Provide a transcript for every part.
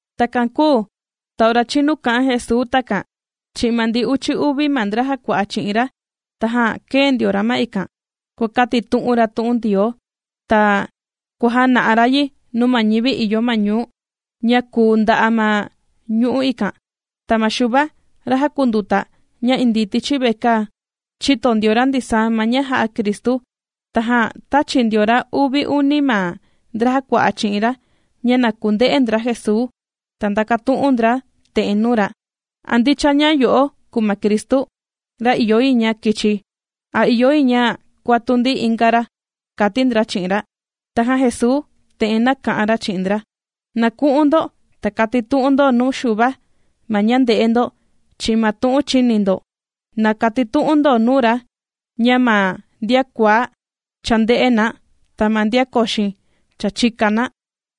Takan kūu ta ora chīnu kā'an Jesuu takan chi'in ma ndi uchi uvi ma ndra jàkua'a chi'in ra, tajan kēe ndio ra ma ikan, kuàkatitu'un ra tu'un Ndioo, ta kua jàna'a ra yi nuu ma ñivi ìyo ma ñuu, ña kùu nda'a' ma ñu'u' ikan. Ta ma Xuva, ra jàkunduta ña indii tichi vekaa, chīto ndio ra ndisaa ma ña jà'a Cristu. Tajan tāchi ndio ra uvi uni ma ndra jàkua'a chi'in ra ña na kunde'e ndra Jesuu, ta ndakatu'un ndra te'en nuu ra: ―¿A ndicha ña yo'o kùu ma Cristu, ra ìyo yi ña kichi, a ìyo yi ña kuatu ndi inga ra? ―kàti ndra chi'in ra. Tajan Jesuu te'en nāka'an ra chi'in ndra: ―Na ku'un ndo, ta katitu'un ndo nuu Xuva, ma ña ndè'e ndo, chi'in ma tu'un chìni ndo. Na katitu'un ndo nuu ra ña ma ndian kuaá, cha ndè'e na, ta ma ndian koxo cha chìka na,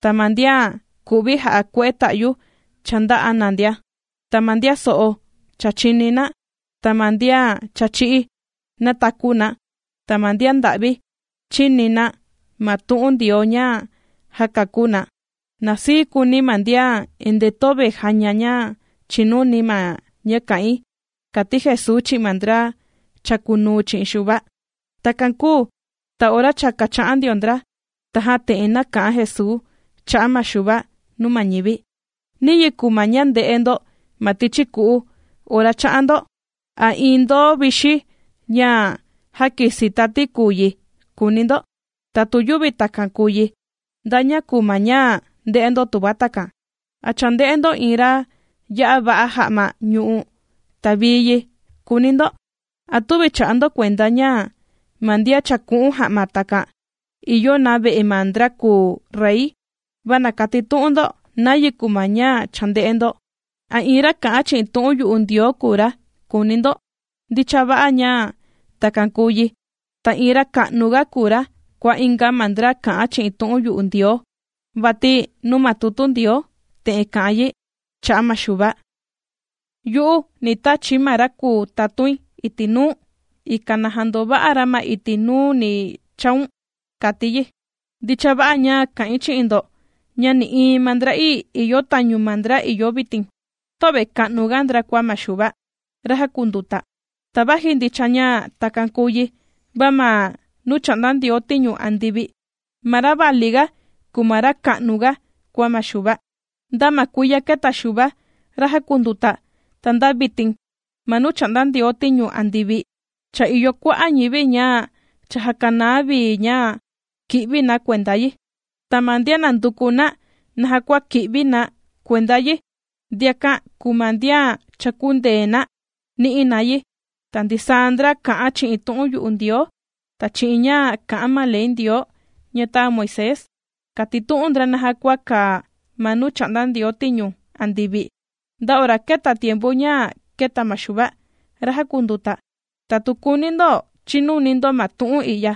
ta ma ndian kù'vi jà'a kue'e ta'yu cha ndā'a na ndia. Ta ma ndian so'o cha chìni na, ta ma ndian cha chī'í nàtaku na, ta ma ndian nda'vi chìni na ma tu'un Ndioo ña jàkakú na. Na sii kuuni ma ndian endee töve jàña ña chìnuni ma ña kà'in ―kàti Jesuu chi'in ma ndra chàkunuu chi'in Xuva. Takan kūu ta ora cha kàcha'an ndio ndra, tajan te'en nāka'an Jesuu cha'a' ma Xuva nuu ma ñivi: ―¿Niyi kùu ma ña chānde'e ndo ma tichi ku'u ora chā'an ndo? ¿A iin ndoó vixi ña jākisi tati kùu yi?, kùuni ndo. Ta tu yüvi takan kùu yi, ¿nda ña kùu ma ña chānde'e ndo?, tuva takan. ¿A chānde'e ndo iin ra ya'a va'a ja'ma ñù'u, ta vii yi?, kùuni ndo. ¿A tüvi chà'a ndo kuenda ña ma ndian chàku'un ja'ma takan, ìyo na ve'e ma ndra kùu rey? Va na katitu'un ndo, ¿nayi kùu ma ña chānde'e ndo? ¿A iin ra kà'an chi'in tu'un yu'u Ndioo kùu ra?, kùuni ndo. Ndicha va'a ña takan kùu yi. Ta iin ra ka'nuga kùu ra kua inga ma ndra kà'an chi'in tu'un yu'u Ndioo. Vati nuu ma tutu Ndioo te'en kà'an yi cha'a' ma Xuva: Yu'u, ni tachi̱ ma ra kùu tatuin iti' nuu̱n, ikan na jandova'a ra ma iti' nuu ni chaun, kàti yi. Ndicha va'a ña ka'in chi'in ndo, ña nï'iin ma ndra'ii ìyo tañu ma ndra ìyo vitin, töve ka'nuga ndra kua ma Xuva, ra jàkunduta. Ta vaji ndicha ña takan kùu yi, va ma nuu chà'nda Ndioo tiñu andivi, ma ra valiga kùu ma ra ka'nuga kua ma Xuva. ’Nda ma kuiya kēta Xuva, ra jàkunduta, ta nda vitin, ma nuu chà'nda Ndioo tiñu andivi cha ìyo kua'a' ñivi ña cha jākanaa vi ña ki'vi na kuenda yi. Ta ma ndian nànduku na naja kua kì'vi na kuenda yi, ndiakan kùu ma ndian cha kundee na nī'i na yi. Ta ndisaa ma ndra kà'an chi'in tu'un yu'u Ndioo, ta chi'in ña kà'an ma ley Ndioo ña tāa Moisés, kātitu'un ndra naja kua kàa ma nuu chà'nda Ndioo tiñu andivi, nda ora kēta tiempu ña kēta ma Xuva, ra jàkunduta. Ta tu kùuni ndo chinuni ndo ma tu'un i'ya,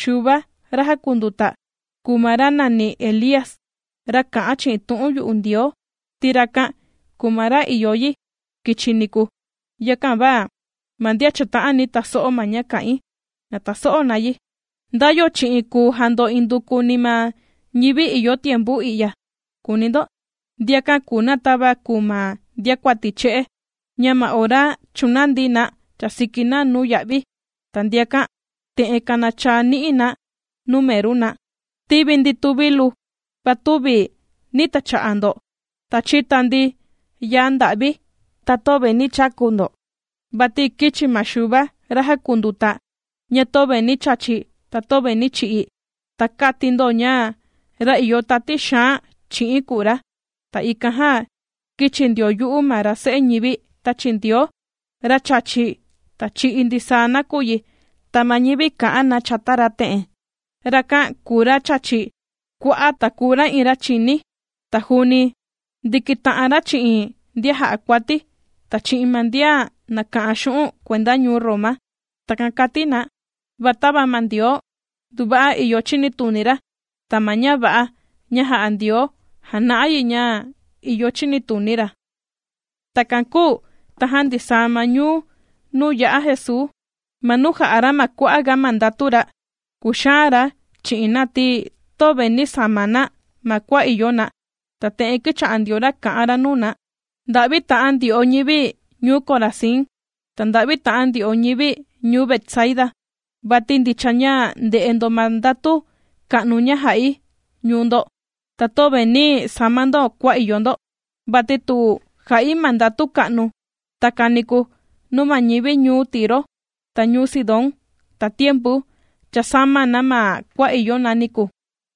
Xuva ra jàkunduta, kùu ma ra nàni Elía, ra kà'an chi'in tu'un yu'u Ndioo, ti rakan kùu ma ra ìyo yi kichi niku. Yakan va ma ndian chàta'ani taso'o ma ña kà'in, na taso'o na yi. ’¿Nda yo chi'in kùu jando indukuni ma ñivi ìyo tiempu i'ya?, kùuni ndo. Ndiakan kùu na tava kùu ma ndiakuati che'e, ña ma ora chūnandi na chàsiki na nuu ya'vi, ta ndiakan te'en kanachaa ni'i na nuu meru na: “Tīvi ndi tuvilu, va tüvi nī tacha'a ndo. Ta chīta ndi yaa nda'vi, ta töve nī chaku ndo.” Vati kīchi ma Xuva, ra jakunduta, ña töve nī chachi ta töve nī chi'i, ta kāti ndo ña ra ìyo tati xaan chi'in kùu ra. Ta ikan jan kīchi ndio yu'u ma ra Se'e ñivi tāchi Ndioo, ra chàchi, ta chì'i ndisaa nakuyi. Ta ma ñivi kà'an na chata ra te'en: “Rakan kùu ra chàchi kua'a' ta kùu ra iin ra chìní, ta juuni ndìkita'an ra chi'in ndian jà'a kuati, ta chi'in ma ndian nàka'an xu'un' kuenda ñuu Roma.” Takan kàti na. Va tava ma Ndioo nduva'a ìyo chinituni ra, ta ma ña va'a ña jà'a Ndioo jàna'a yi ña ìyo chinituni ra. Takan kūu tajan ndisaa ma ñuu nuu yā'a Jesuu, ma nuu jā'a ra kua'aga ma ndatu ra, kūxaan ra chi'in na ti töve nī sama na ma kua ìyo na, ta te'en kīcha'a ndio ra kà'an ra nuu na: ―¡Nda'vi ta'an ndyo'o ñivi ñuu Corazín! Ta, ¡nda'vi ta'an ndyo'o ñivi ñuu Betsaida! Vati ndicha ña ndē'e ndo ma ndatu ka'nu ña jà'i ñuu ndo. Ta töve nī sama ndo kua ìyo ndo. Vati tu ja'i ma ndatu ka'nu takan niku nuu ma ñivi ñuu Tiro, ta ñuu Sidón, tatiempu cha sāma na ma kua ìyo na niku,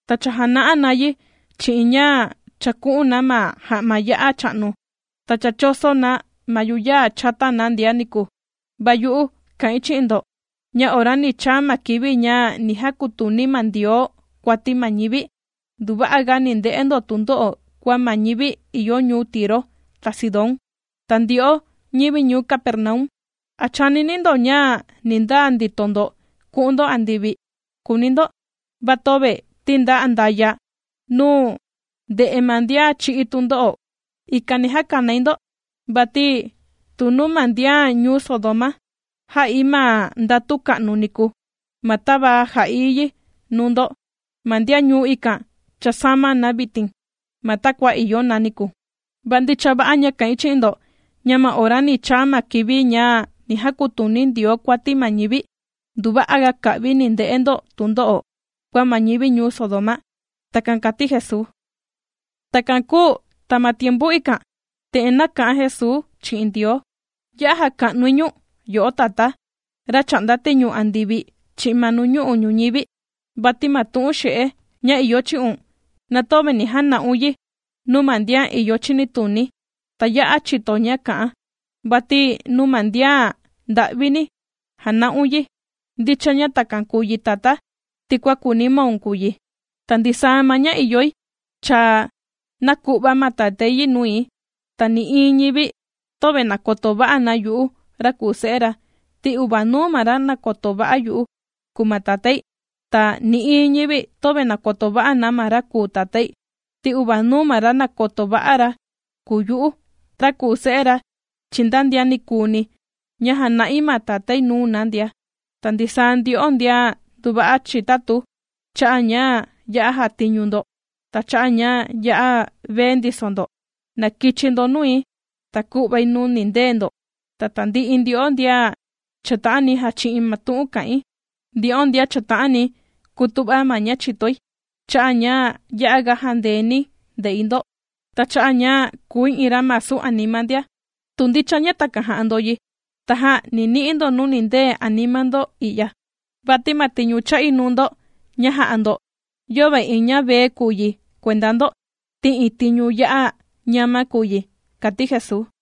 ta cha jāna'a na yi chi'in ña chàku'un na ma ja'ma ya'a cha'nu, ta cha chōso na ma yuyaa chata na ndia niku. Va yu'u kà'in chi'in ndo ña ora ni chaa ma kivi ña ni jakutuni ma Ndioo kuati ma ñivi, nduva'aga ni nde'e ndo tundo'o kua ma ñivi ìyo ñuu Tiro, ta Sidón. Ta ndyo'o ñivi ñuu Capernaum, ¿a chànini ndo ña ni ndaa ndito ndo ku'un ndo andivi?, kùuni ndo. Va töve ti nda andaya' nuu ndè'e ma ndian chī'í tundo'o, ikan ni jakanai ndo. Vati tu nuu ma ndian ñuu Sodoma, jā'i ma ndatu ka'nu niku, ma tava jā'i yi nuu ndo, ma ndian ñuu ikan, cha sāma na vitin ma takua ìyo na niku. Va ndicha va'a ña kà'in chi'in ndo, ña ma ora ni chaa ma kivi ña ni jakutuni Ndioo kuati ma ñivi, nduva'aga ka'vi, ni nde'e ndo tundo'o, kua ma ñivi ñuu Sodoma. ―Takan kàti Jesuu. Takan kūu ta ma tiempu ikan, te'en nāka'an Jesuu chi'in Ndioo: ―Ya'a jàka'nui ñu̱n yo'o Tatá, ra chà'nda tiñu andivi chi'in ma nuñu'u' ñuñivi, vati ma tu'un xe'e ña ìyo chi'un, na töve nī jana'un yi nuu ma ndian ìyo chinituni, ta ya'a chìto ña kà'an, vati nuu ma ndian nda'vini jāna'un yi. Ndicha ña takan kūu yi Tatá, ti kua kūuni maun kùu yi. ’Ta ndisaa ma ña ìyoi, cha nāku'va ma Tatái yi nui. Ta nï'iin ñivi, töve nàkoto va'a na yu'u ra kùu Se'e ra, ti uvanuu ma ra nàkoto va'a yu'u, kùu ma Tatái. Ta nï'iin ñivi töve nàkoto va'a na ma ra kùu Tatái, ti uvanuu ma ra nàkoto va'a ra kùu yu'u, ra kùu Se'e ra chi'in nda ndian ni kùuni ña jana'i ma Tatái nuu na ndia. Ta ndisaa ndyo'o ndian nduva'a chitatu, cha'a' ña ya'a jàtiñu ndo, ta cha'a' ña ya'a vee ndiso ndo, na kichi ndo nui, ta ku'vai nuu nindee ndo. Ta tandi'i ndyo'o ndian chàta'ani jàchi'in ma tu'un kà'in, ndyo'o ndian chàta'ani kutu'va ma ña chìtoi, cha'a' ña ya'aga jàndeeni̱ nde'i ndo, ta cha'a' ña kùi iin ra masu anima ndia. Tu ndicha ña takan jà'a ndo yi, tajan ni ni'i ndo nuu nindee anima ndo i'ya. Vati ma tiñu chà'i nuu ndo ña jà'a ndo, yöve iin ña vee kùu yi kuenda ndo, ti iin tiñu ya'a ñama kùu yi ―kàti Jesuu.